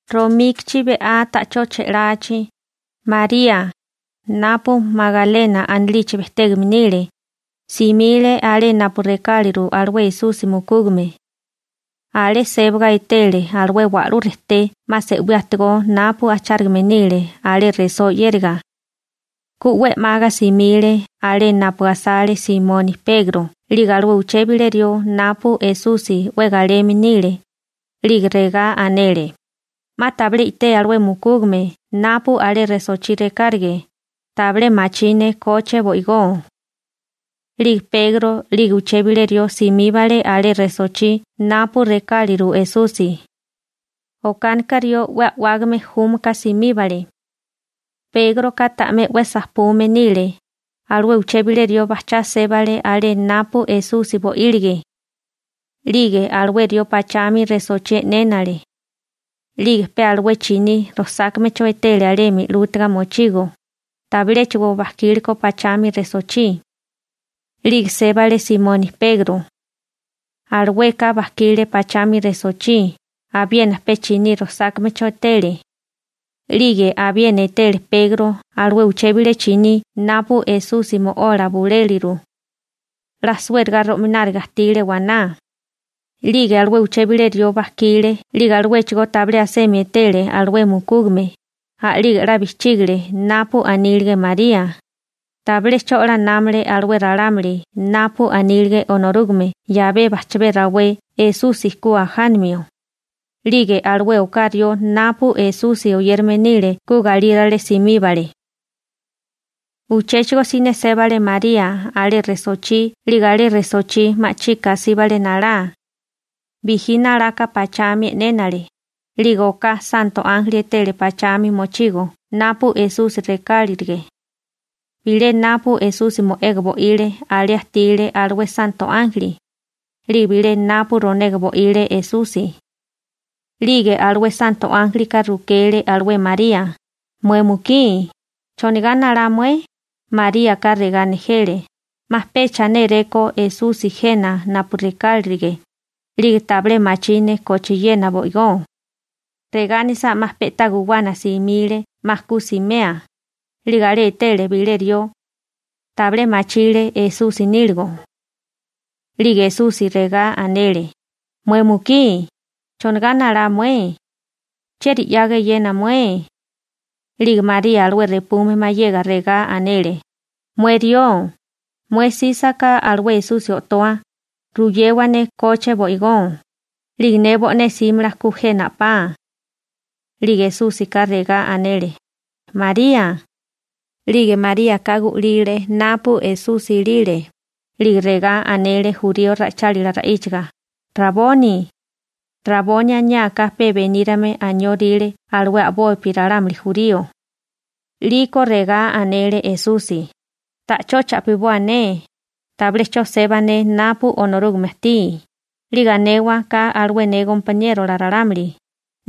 Romíkichi be'á ta'chó che'lachi, María, napu Magalena anilichi bejtégame nile, simile alé napu rekáliru alué Esusi mukúgame. Alé sébaga etele alué wa'lú rejté 'ma se'wí ajtigó napu ajchárigame nile alé resó 'yériga. Ku 'we 'maga simile alé napu asale Simoni Pegro 'lige alué uché bilé rió napu Esusi 'we galeme nile, 'lige regá anele: ―'Ma tabilé i'té alué mukúgame napu alé resochí rekárige, tabilé machí ne koche bo'igó. 'Lige Pegro 'lige uché bilé rió simíbale alé resochí napu rekáliru Esusi. Okánika rió 'we a'wágame júmaka simíbale. Pégroka ta'mé 'we sajpume nile, alué uché bilé rió bajchá sébale alé napu Esusi bo'ílige. 'Lige alué rió pachami resochí e'nénale. 'Lige pe alué chiní rosákamecho etele alemi 'lútiga mochigo, tabiléchigo bajkíleko pachami resochí. 'Lige sébale Simoni Pegro. Alueka bajkile pachami resochí, abiena pe chiní rosákamecho etele. 'Lige abiena etele Pegro alué uché bilé chiní napu Esusi mo'ola buléliru. 'La suériga ro'mináriga ajtile waná. 'Lige alué uché bilé rió bajkile 'lige aluéchigó tabilé asemi etele alué mukúgame, a'lige 'la bijchígile napu anílige María. Tabilé 'cho 'la námale alué ralámuli napu anílige Onorúgame 'yabé bajchabé rawé Esusi ku ajanamio. 'Lige alué oká rió napu Esusi oyérame nile ku galírale simíbale. Uchéchigo siné sébale María alé resochí 'lige alé resochí ma'chika asíbale nalá. Bijí nalaka pachami e'nénale, 'Lige oká santo ánjeli etele pachami mochigo napu Esusi rekárilige. Bilé napu Esusi mo'ega bo'ile, alé ajtile alué santo ánjeli, 'lige bilé napu ronega bo'ile Esusi. 'Lige alué santo ánjelika rukele alué María: ―Mué mukí, ¿chonigá nalá mué? Maríaka regá nejele: ―'Ma pecha néréko Esusi jena napu rekárilige, 'lige tabilé machí ne kochiena bo'igó. Regá anisá 'ma pe'tá guwana simile 'ma ku simea, 'lige alé etele bilé rió. Tabilé machile Esusi níligo. 'Lige Esusi regá anele: ―Mué mukí, ¿chonagá nalá mué? ¿Chieri 'yaga eyena mué? 'Lige María alué repume mayega, regá anele: ―Mué rió, mué 'sísaká alué Esusi o'toa, ruyewa ne koche bo'igó, 'lige ne bo'né 'símala ku jena a'pá. 'Lige Esúsika regá anele: ―¡María! 'Lige Maríaka gu'lile napu Esusi ilile, 'lige regá anele jurío ra'ichálila ra'íchaga: ―¡Raboni! (Raboni aniá ka pe benírame anióríle alué a'bopi ralámuli jurío.) 'Liko regá anele Esusi: ―Ta'chó cha'piboa ne, tabilé 'cho seba ne napu Onorúgame ajtí, 'lige anewa ka alué ne gompaniérola ralámuli,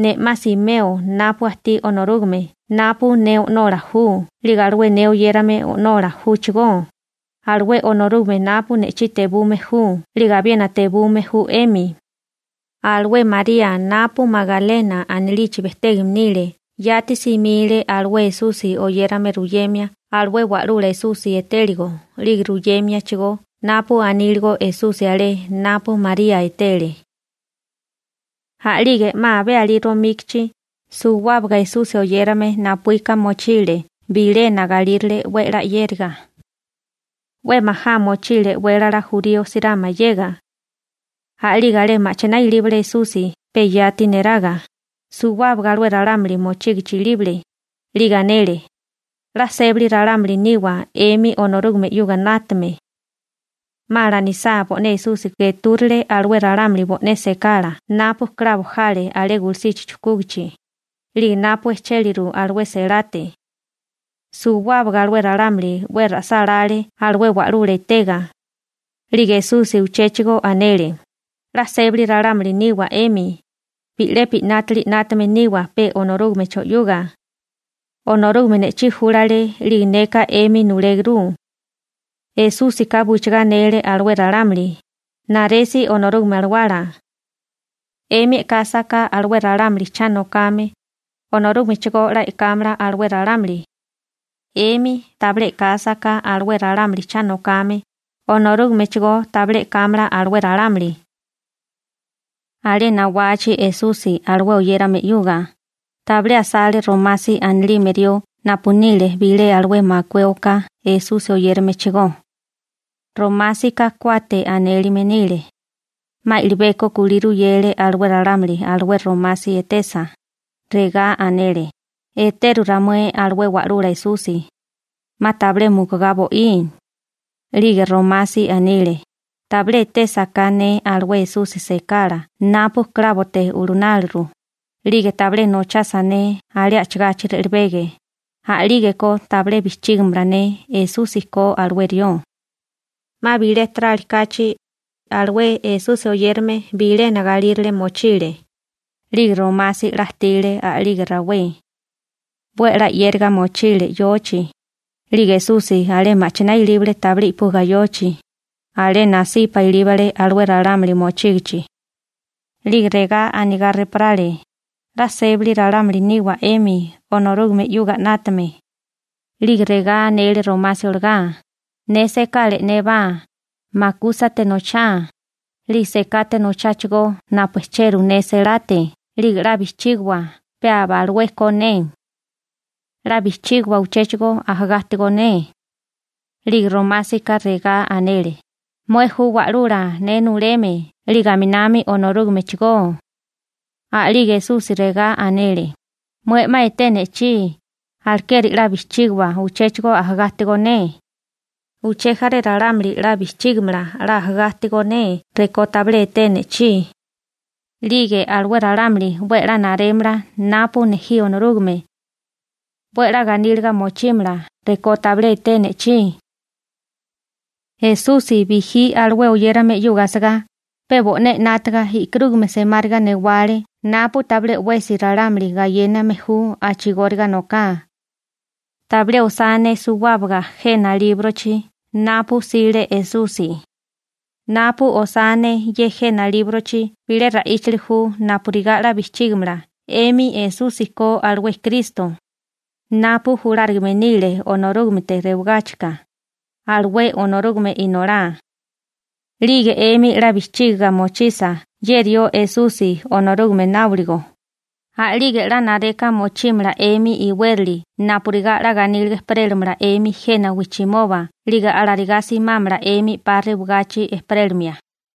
ne 'ma simeo napu ajtí Onorúgame napu ne O'nola ju 'lige alué ne oyérame O'nola júchigó, alué Onorúgame napu ne'chí tebume ju 'lige abiena tebume ju 'emi. Alué María napu Magalena anilichi bejtégame nile yati simile alué Esusi oyérame ruyemia alué Wa'lula Esusi etéligo 'lige ruyémiachigó napu aníligo Esusi alé napu María etele. A'lige 'ma abé alí romíkichi, suwábaga Esusi oyérame napuíka mochile bilena galírale 'we 'la 'yériga. 'We majá mochile e'wélala jurío sirá mayega. A'lige alé ma'chiná ilíbale Esusi pe yati neraga, suwábaga alué ralámuli mochígichi ilíbale, 'lige anele: ―'La sébali ralámuli niwa 'emi Onorúgame 'yuga 'nátame. 'Ma alanisá, bo'né Esusi getúrile alué ralámuli bo'né sekala napu klabo jale alé gulusichi chujkúgichi, 'lige napu ejchéliru alué selate. Suwábaga alué ralámuli 'we ra'sálále alué Wa'lula etega. 'Lige Esusi uchéchigo anele: ―'La sébali ralámuli niwa 'emi, bi'lepi 'nátili 'nátame niwa pe Onorúgamecho 'yuga. Onorúgame ne'chí júlale 'lige neka 'emi nuléguru. Esúsika buchigá anele alué ralámuli: ―Naresi Onorúgame Alawala. 'Emi e'kásaká alué ralámuli cha nokame, Onorúgame chigó 'la e'kámala alué ralámuli. 'Emi tabilé e'kásaká alué ralámuli cha nokame, Onorúgamechigó tabilé e'kámala alué ralámuli. Alé nawachi Esusi alué oyérame 'yuga, tabilé asale Romasi anilime rió napu nile bilé alué makué oká Esusi oyéramechigó. Romásika «Kuate» anélime nile. 'Ma i'libeko kulí ruyele alué ralámuli alué Romasi etesa, regá anele: ―Eteru ramué alué Wa'lula Esusi. 'Ma tabilé mukugá bo'í. 'Lige Romasi anile: ―Tabilé etésaká ne alué Esusi sekala napu klábote ulunáluru, 'lige tabilé nochasa ne alé a'chigachi re'lebege, a'lígeko tabilé bijchígamala ne Esusi ko alué rió. 'Ma bilé tarali kachi, alué ralámuli Esusi oyérame bilena galírale mochile, 'lige Romasi 'la ajtile a'lige rawé. 'We a'lá 'yériga mochile yochi, 'lige Esusi alé ma'chiná ilíbale tabilé i'puga yochi, alé nasipa ilíbale alué ralámuli mochígichi. 'Lige regá anigá repórale regá anigá: ―'La sébali ralámuli niwa 'emi Onorúgame 'yuga 'nátame. 'Lige regá anele Romasi olagá: ―Ne sekala e'nébá, makúsate nochá, 'lige sekate nochábá napu ejcheru ne selate 'lige 'la bijchígiwa pe abalué ko ne. 'La bijchígiwa uchéchigo ku ajagá ajtigó ne. 'Lige Romásika regá anele: ―¡Mué ju Wa'lula ne nuleme 'lige aminami Onorúgamechigó! A'lige Esusi regá anele: ―Mué 'ma eté ne'chí, alekeri 'la bijchígiwa ku ajagá ajtigó ne. Uché jaré ralámuli 'la bijchígimala ku ajagá ajtigó ne rekó tabilé etee ne'chí. 'Lige alué ralámuli 'we a'lá narémala napu nejí Onorúgame. 'We a'lá ganíliga mochímala rekó tabilé etee ne'chí. Esusi bijí alué bo'né oyérame 'yuga asagá, pe bo'né 'nátaga e'karúgame semáriga newale napu tabilé 'wesi ralámuli gayéname ju a'chigóriga noká. Tabilé osá ne suwábaga jena líbrochi napu 'sile Esusi. Napu osá ne ye jena líbrochi bilé ra'íchali ju napurigá 'la bijchígamala 'emi Esusi ko alué Kristo, napu julárigame nile Onorúgamete rewagáchika, alué Onorúgame Inolá. 'Lige 'emi 'la bijchígiga mochisa ye rió Esusi Onorúgame náboligo, a'lige 'la nareka mochímala 'emi iwérali napurigá 'la ganíliga ejperélamala 'emi jena wijchimoba 'lige alarigá simámala 'emi 'pa rewagachi ejperélimia.